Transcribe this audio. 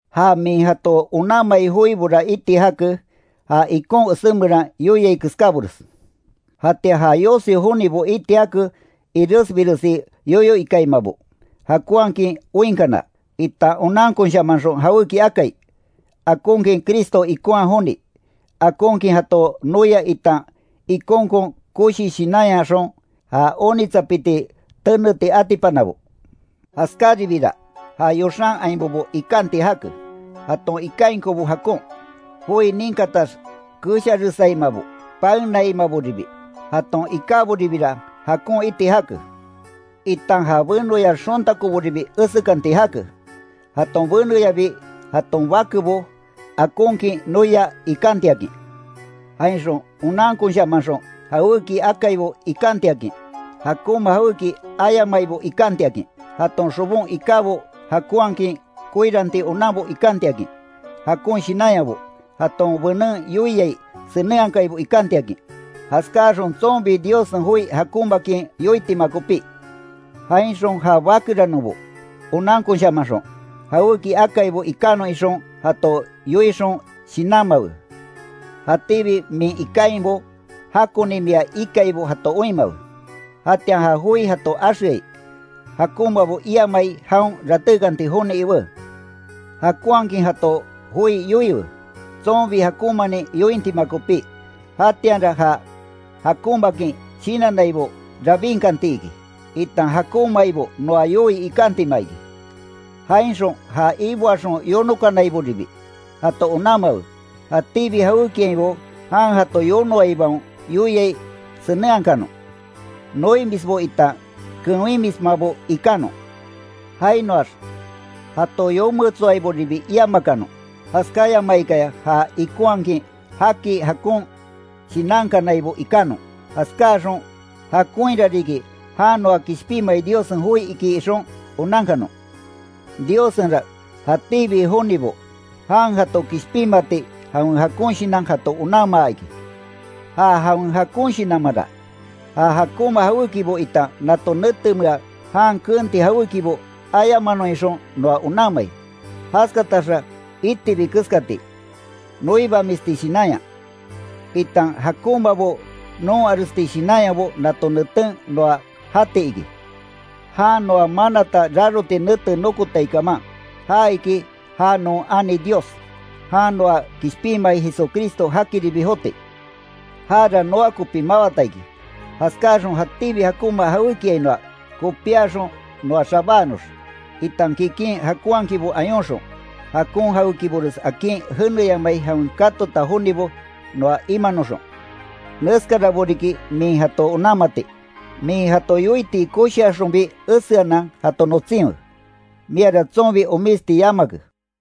Ja min jato onanmai joibora iti jake, ja ikon esé meran yoiai keskábores. Jatian ja yosi jonibo iti jake iresbiresi yoyo ikaimabo, jakonhakin oinkana, itan onankonshamanxon jawéki akai, akonkin Cristo ikonha joni, akonkin jato noia itan ikonkon koshi shinanyaxon ja onitsapiti teneti atipanabo. Jaskáribiira, ja yoxan ainbobo ikanti jake, jaton ikainkobo jakon, joi ninkatax kesharesaimabo, paenaimaboribi. Jaton ikáboribira jakon iti jake, itan ja benoya xontakoboribi esekanti jake, jaton beneyabi jaton bakebo akonkin noia ikantiakin. Jainxon onankonshamanxon jawéki akaibo ikantiakin, jakonma jawéki ayamaibo ikantiakin, jaton xobon ikábo jakonhakin koiranti onanbo ikantiakin, jakon shinanyabo, jaton benen yoiai senenhakaibo ikantiakin. Jaskáxon tsonbi Diossen joi jakonmaakin yoitima kopí. Jainxon ja bakeranonbo, onankonshamanxon, jawéki akaibo ikanon ixon jato yoixon shinanmawe, jatíbi min ikainbo jakoni mia ikaibo jato oinmawe; jatian ja joi jato axeai, jakonmabo iamai jaon ratékanti joni iwé. Jakonhakin jato joi yoiwe, tsonbi jakonmanin yointima kopí. Jatianra ja jakonmaakin shinannaibo rabinkanti iki, itan jakonmaibo noa yoii ikantima iki. Jainxon ja iboaxon yonokanaiboribi, jato onanmawe, jatíbi jawékiainbo jan jato yonoaibaon yoiai senenhakanon, noimisbo itan kewinmismabo ikanon. Jainoax jato yometsoaiboribi iamakanon, jaskáyamaikaya ja ikonhakin jaki jakon shinankanaibo ikanon. Jaskáxon, jakonhira riki jan noa kishpinmai Diossen joi iki ixon onankanon. Diossenra jatíbi jonibo jan jato kishpinmati jawen jakon shinan jato onanmaa iki. Ja jawen jakon shinanmanra, ja jakonma jawékibo itan nato netemea jan keenti jawékibo ayamanon ixon noa onanmai. Jaskataxa itibi keskati, noibamisti shinanya, itan jakonmabo noonharesti shinanyabo nato neten noa jati iki. Jan noa manata raroti nete nokotai kaman, ja iki ja non ani Dios, jan noa kishpinmai Jesucristo jakiribi joti. Jara noa kopi mawata iki, jaskáaxon jatíbi jakonma jawékiainoa kopiaxon noa xabáanox, itan kikin jakonhakinbo ayonxon, jakon jawékibores akin jeneyamai jawen katota jonibo noa imanoxon. Neskarabo riki min jato onanmati, min jato yoiti koshiaxonbi eseanan jato notsinwe. Miara tsonbi omisti yamake.